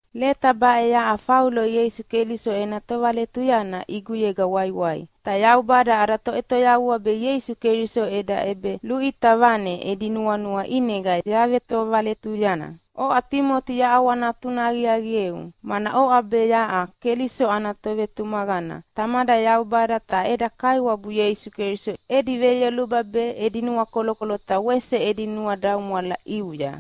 Leta baʼe yaʼa Faulo Ieisu Keliso ena tovaletuyana ʼiguyega waiwai. Ta Yaubada ada Toʼetoyavua be Ieisu Keliso eda ʼebeluʼita vane edi nuanua ʼinega yavetovaletuyana. Oʼa Timoti yaʼawanatuna aqiaqieu, mana oʼa be yaʼa Keliso ana tovetumaqana. Tamada Yaubada ta eda Kaiwabu Ieisu Keliso edi veyoluba be, edi nuakolokolo ta wese edi nuadaumwala ʼiuya.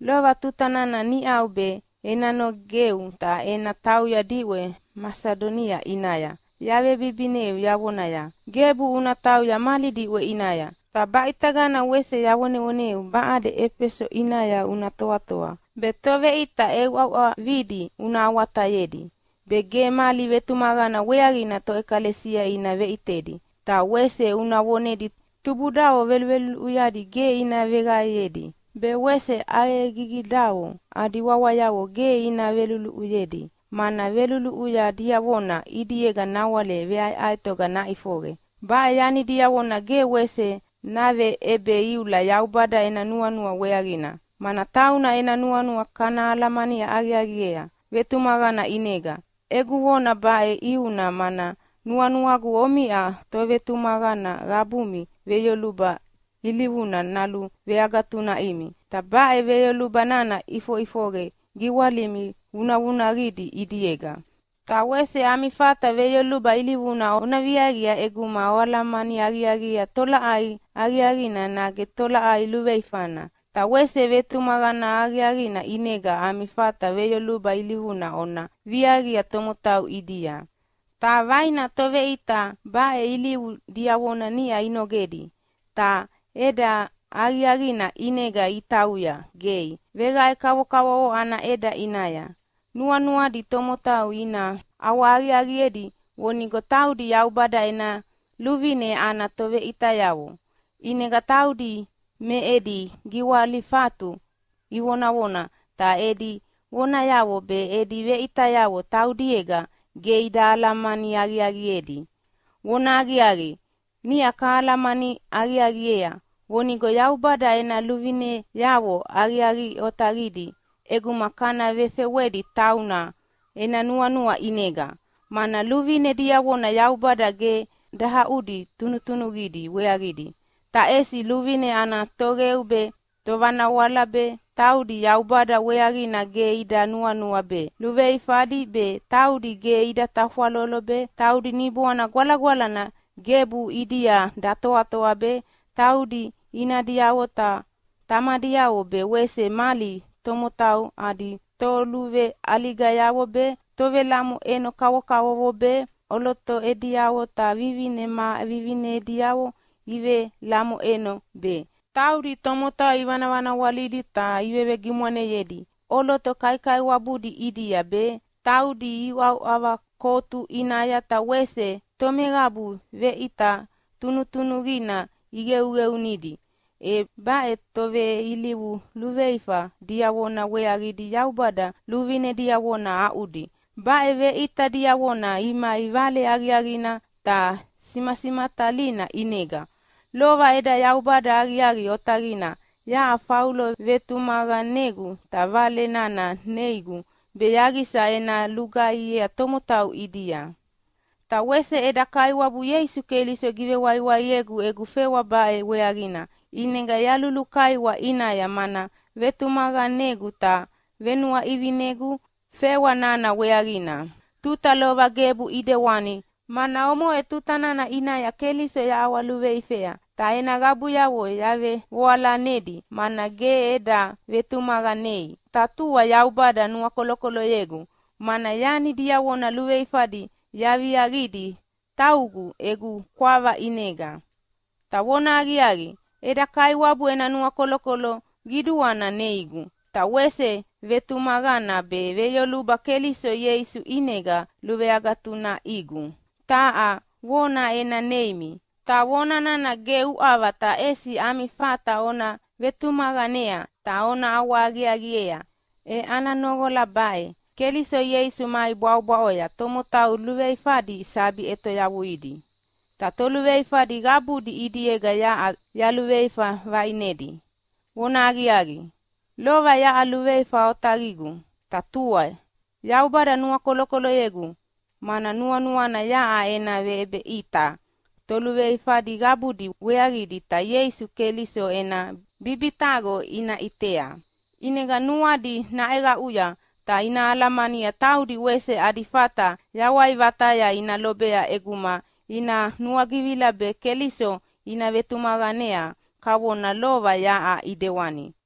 Lova tuta nana niʼau be ena nogeu ta ena tauya diʼwe Masidonia ʼinaya yavebibineu yavonaya, “Gebu una tauya mali diʼwe ʼinaya.” Ta baʼitagana wese yavonevoneu baʼade Efeso ʼinaya una toatoa be toveʼita ʼeuʼauʼavidi una awatayedi be ge mali vetumaqana weaqina toʼekalesia ina veʼitedi. Ta wese una vonedi tubudavo veluluʼuyadi ge ina veqaeyedi, be wese ʼaqegigidavo adi wawayavo ge ina veluluʼuyayedi, mana veluluʼuya diavona ʼidiega nawale veʼaeʼaetoga naʼifoqe. Baʼe yani diavona ge wese naveʼebeiula Yaubada ena nuanua weaqina, mana tauna ena nuanua kana alamani aqiaqiea vetumaqana ʼinega. Egu vona baʼe ʼiuna mana nuanuagu omiʼa tovetumaqana qabumi veyoluba ilivuna naluveagatunaʼimi. Ta baʼe veyoluba nana ʼifoʼifoqe giwalimi vunavunaqidi ʼidiega. Ta wese ami fata veyoluba ilivuna ona viaqia ʼeguma oalamani aqiaqiea tolaʼai aqiaqina nage tolaʼai luveifana. Ta wese vetumaqana aqiaqina ʼinega ami fata veyoluba ilivuna ona viaqia tomotau ʼidia. Ta vaina toveʼita baʼe ilivu diavona niʼa inogedi, ta ʼeda aqiaqina ʼinega itauya gei veqae kavokavovo ana ʼeda ʼinaya. Nuanuadi tomotau ina ʼawahaqiaqiedi vonigo taudi Yaubada ena luvine ana toveʼitayavo. ʼInega taudi me edi giwalifatu ivonavona, ta edi vonayavo be edi veʼitayavo taudiega ge ida alamani aqiaqiedi. Vonahaqiaqi, niʼa kahalamani aqiaqiea vonigo Yaubada ena luvineavo aqiaqi otaqidi ʼeguma kana vefewedi tauna ena nuanua ʼinega. Mana luvine diavona Yaubada ge dahaʼudi tunutunuqidi weaqidi, ta ʼesi luvine ana toqeu be, tovanawala be, taudi Yaubada weaqina ge ida nuanua be, luluveifadi be, taudi ge ida tafwalolo be, taudi Niboana Gwalagwalana gebu ʼidia datoatoa be, taudi inadiavo ta tamadiavo be wese mali tomotau adi toluveʼaligayavo be, tovelamoʼeno kavokavovo be, ʼoloto ma ʼoloto ediavo ta vivine ma vivine ediavo ivelamoʼeno be, taudi tomotau ivanavanawalidi ta ivevegimwaneyedi ʼoloto kaikaiwabudi ʼidia be, taudi iuʼauʼava kotu ʼinaya ta wese tomeqabu veʼita tunutunuqina iqeuqeunidi, e baʼe toveilivu luveifa diavona weaqidi Yaubada luvine diavona aʼudi. Baʼe veʼita diavona imai Vale Aqiaqina ta simasimatalina ʼinega. Lova eda Yaubada aqiaqi otaqina yaʼa Faulo vetumaqanegu ta Vale nana neigu be yaqisa ena lugaihiea tomotau ʼidia. Ta wese eda Kaiwabu Ieisu Keliso givewaiwaiegu egu fewa baʼe weaqina. ʼInega yalulukaiwa ʼinaya, mana vetumaqanegu ta venuaʼivinegu fewa nana weaqina. Tuta lova gebu ʼidewani, mana omoʼe tuta nana ʼinaya Keliso yaʼawaluveifea, ta ena qabuyavo yavevoalanedi, mana ge eda vetumaqanei. Ta tua Yaubada nuakolokoloyegu, mana yani diavona luveifadi yaviaqidi taugu egu kwava ʼinega. Ta vonahaqiaqi, eda Kaiwabu ena nuakolokolo qiduana neigu, ta wese vetumaqana be veyoluba Keliso Ieisu ʼinega luveagatunaʼigu. Taha vona ena neimi, ta vona nana ge uʼava ta ʼesi ami fata ona vetumaqanea ta ona ʼawahaqiaqiea, e ana noqola baʼe: Keliso Ieisu mai bwaʼobwaʼoya tomotau luluveifadi sabi ʼetoyavuidi. Ta toluveifadi qabudi ʼidiega yaʼa yaluveifa vaʼinedi. Vonahaqiaqi, lova yaʼa luveifa otaqigu. Ta tua Yaubada nuakolokoloyegu, mana nuanuana yaʼa ena veʼebeʼita toluveifadi qabudi weaqidi ta Ieisu Keliso ena bibitaqo ina ʼitea, ʼinega nuadi naʼeqaʼuya ta ina alamania taudi wese adi fata yawai vataya ina lobea ʼeguma ina nuagivila be Keliso ina vetumaqanea kavona lova yaʼa ʼidewani.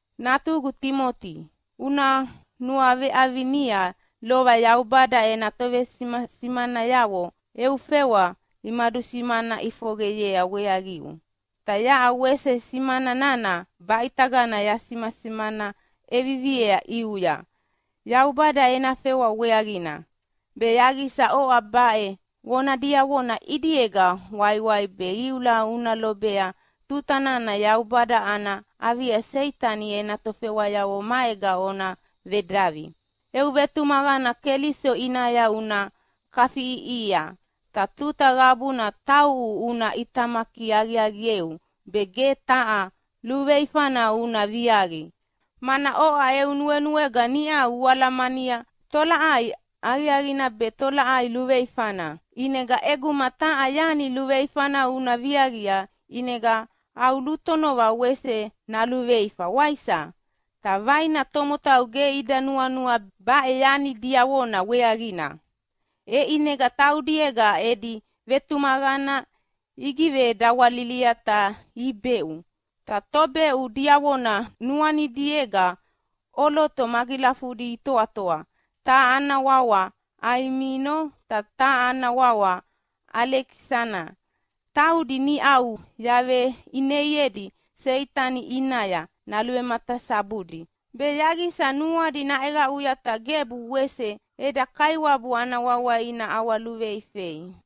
Natugu Timoti, una nuaveʼavinia lova Yaubada ena tovesimasimanayavo eu fewa imadusimana ʼifoqeyea weaqiu. Ta yaʼa wese simana nana baʼitagana yasimasimana ʼeviviea ʼiuya Yaubada ena fewa weaqina, be yaqisa oʼa baʼe vona diavona ʼidiega waiwai be iula una lobea tuta nana Yaubada ana avia Seitani ena tofewayavo maega ona vedavi. Eu vetumaqana Keliso ʼinaya una kafiʼiʼihia, ta tuta qabuna tauʼu una ʼitamaki aqiaqieu be ge taha luveifana una viaqi, mana oʼa eu nuenuega niʼa ualamania tolaʼai aqiaqina be tolaʼai luveifana. ʼInega ʼeguma taha yani luveifana una viaqia ʼinega au lutonova wese naluveifa, waisa? Ta vaina tomotau ge ida nuanua baʼe yani diavona weaqina, e ʼinega taudiega edi vetumaqana igivedawalilia ta ibeʼu. Ta tobeʼu diavona nuanidiega ʼoloto magilafudi itoatoa, taha ana wawa Aiminio ta taha ana wawa Alekisana. Taudi niʼau yaveʼineiedi Seitani ʼinaya naluvematasabudi, be yaqisa nuadi naʼeqaʼuya ta gebu wese eda Kaiwabu ana wawa ina ʼawaluveifei.